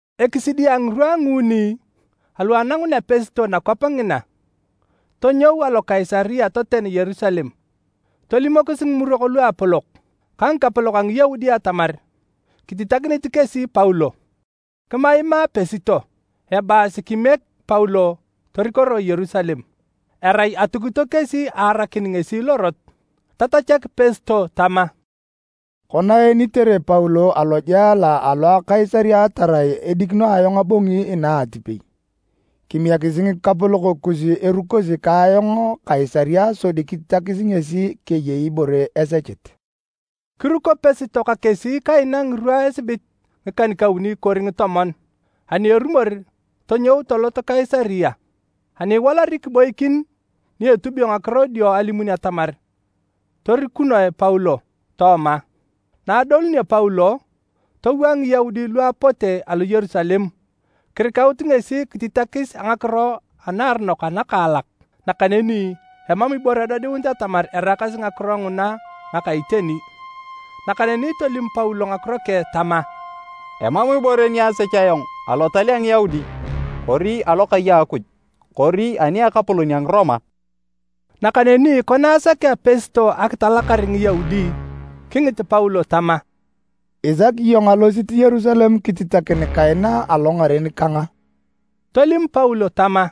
Ekisidi a ngirwa a nguuni alu anangunea Pesto nakwap ngina, tonyou alo Kaisaria toten Yerusalem, tolimokis Ngimurok Luapolok ka ngikapolok a Ngiyaudi atamar kititakinit kesi Paulo. Kimaimaa Pesto, ebaasi kimiek Paulo torikoroe Yerusalem. Erai atukito kesi aarakin ngesi lorot. Tatachak Pesto tama, “Kona eenitere Paulo alojela alo Kaisaria tarai edikino ayong abongi inaa atipei, kimiekisi ngikapolok kus erukosi ka ayong Kaisaria sodi kititakis ngesi keyei ibore esechit.” Kiruko Pesto ka kesi kaina ngirwa esibit ngikan-kauni kori ngitomon, ani erumor tonyou tolot Kaisaria. Ani iwalari, kiboikin ni etubio ngakiro dio alimun atamar torikunoe Paulo tooma. Na adolunio Paulo, towaa Ngiyaudi lu apote alo Yerusalem kirikaut ngesi kititakis a ngakiro anaaronok anakaalak. Nakaneni emam ibore edodiunit atamar eraakasi ngakiro nguna ngaka iteni. Nakaneni tolim Paulo ngakiro keng tama, “Emam ibore ni asech ayong Alotal a Ngiyaudi kori alokai a Akuj kori ani a ekapolon a Ngiroma.” Nakaneni kona asakea Pesto akitalakar Ngiyaudi, kingit Paulo tama, “Isaki iyong alosit Yerusalem kititakin kaina alongaren kang a?” Tolim Paulo tama,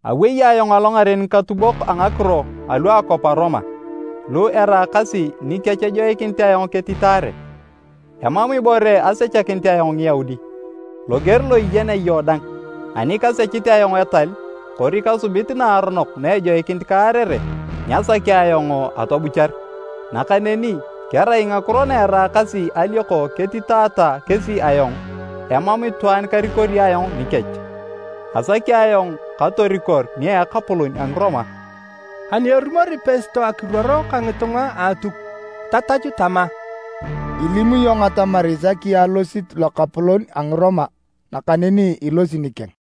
“Awei ayong alongaren ngikatubok a ngakiro alu a akwap a Roma, lu eraakasi nikech ejoikinit ayong ketitaare. Emam ibore asechakinit ayong Ngiyaudi, loger lo iyenea iyong dang. Ani kasechit ayong etal kori kasubit naaronok na ejoikinit kaarere, nyasaki ayong atobuchar. Nakaneni kerai ngakiro na eraakasi alioko ketitaata kesi ayong, emam itwaan karikori ayong nikech. Asaki ayong katorikor nia ekapolon a Ngiroma.” Ani erumori Pesto akiruor ka ngitunga a Atuk, tatachu tama, “Ilim iyong atamar isaki alosit lokapolon a Ngiroma, nakaneni ilosi nikeng.”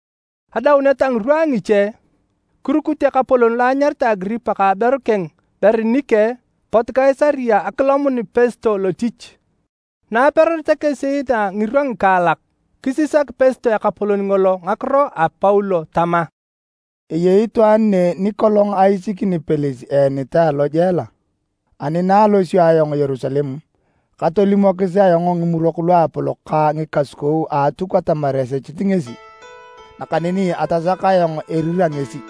Adaunet a ngirwa a ngiche, kirukut ekapolon lo anyaritae Agiripa ka aberu keng Berinike pot Kaisaria akilomun Pesto lotich. Na aperoreta kesi inaa ngirwa ngikaalak, kisisak Pesto ekapolon ngolo ngakiro a Paulo tama, “Eyei itwaan ne nikolong aisikini Pelis eenitae alojela, ani na alosio ayong Yerusalem, katolimokis ayong Ngimurok Luapolok ka ngikasukou a Atuk atamar esechit ngesi, nakaneni tasaka ayong erira ngesi.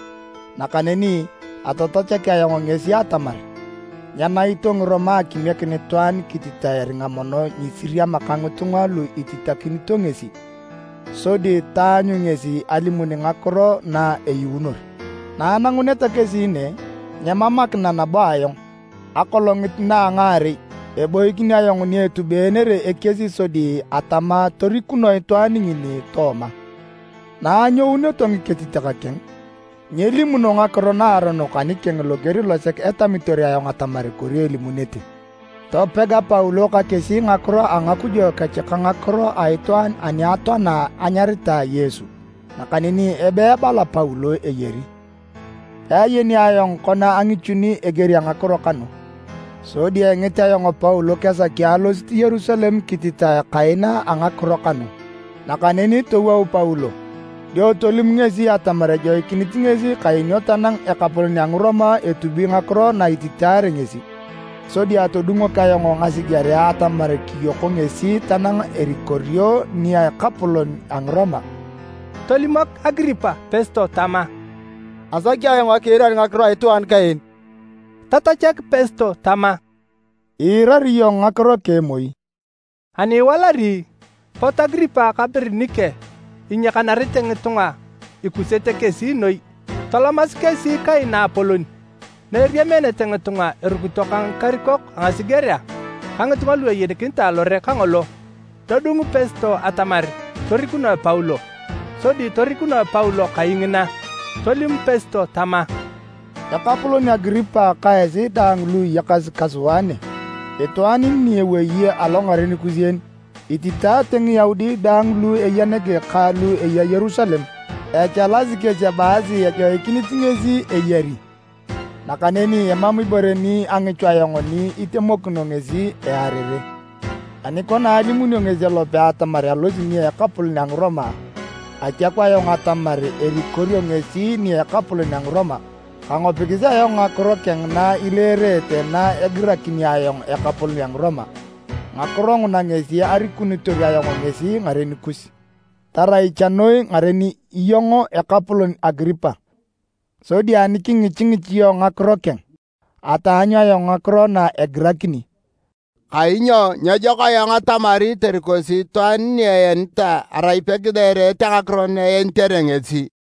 Nakaneni atatachak ayong kesi atamar nyenaito Ngiroma akimiekin itwaan kititae eringa mono nyisiriama ka ngitunga lu ititakinito ngesi sodi taanyu ngesi alimun ngakiro na eyuunor. Na ananguneta kesi ne, nyemamakina nabo ayong. Akolongit na a ngaarei, eboikin ayong ni etubeenere ekies sodi atama torikunoe itwaan ngini tooma. Na anyouneto ngiketitak keng, nyelimuno ngakiro naaronok anikeng loger losek etamitor ayong atamar kori elimunete. Topega Paulo ka kesi ngakiro a ngakujo kech ka ngakiro a itwaan ani atoana anyaritae Yesu, nakaneni abe ebala Paulo eyari. Peayeni ayong kona angichuni eger a ngakiro kanu. Sodi engit ayong Paulo kesaki alosit Yerusalem kititae kaina a ngakiro kanu. Nakaneni towou Paulo. Dio tolim ngesi atamar ejoikinit ngesi kaenio tanang ekapolon a Ngiroma etubi ngakiro na ititaare ngesi. Sodi atodungok ayong ngasigerea atamar kiyoko ngesi tanang erikorio nia ekapolon a Ngiroma.” Tolimok Agiripa Pesto tama, “Asaki ayong akiirar ngakiro a itwaan kaen.” Tatachak Pesto tama, “Iirari iyong ngakiro keng moi.” Ani iwalari, pot Agiripa ka Berinike inyiakanarete ngitunga ikusete kesi noi. Tolomasi kesi kai naapolon na eriameenete ngitunga erukito ka ngikarikok a ngasigerea ka ngitunga lu ayenikinitae alore kangolo. Todung Pesto atamar torikunoe Paulo, sodi torikunoe Paulo kai ngina. Tolim Pesto tama, “Ekapolon Agiripa ka esi daang lu iyakasi ka sua ne, itwaan ni ewei alongaren kus en, ititaate Ngiyaudi daang lu eya nege ka lu eya Yerusalem. Echalasi kesi ebaasi nyejoikinit ngesi eyari! Nakaneni emam ibore ni angichu ayong ni itemokino ngesi earere. Ani kona alimunio ngesi elope atamar alosi nia ekapolon a Ngiroma, atiaku ayong atamar erikorio ngesi nia ekapolon a Ngiroma. Kangopikis ayong ngakiro keng na ileerete na egirakini ayong ekapolon a Ngiroma. Ngakiro nguna ngesi arikunitor ayong ngesi ngaren kus, tarai cha noi ngaren iyong ekapolon Agiripa! Sodi ani kingichingich iyong ngakiro keng, ataanyu ayong ngakiro na egirakini. Kainyo nyejok ayong atamari torikosi itwaan ni eenitae erai peileerete ngakiro na ititaare ngesi.”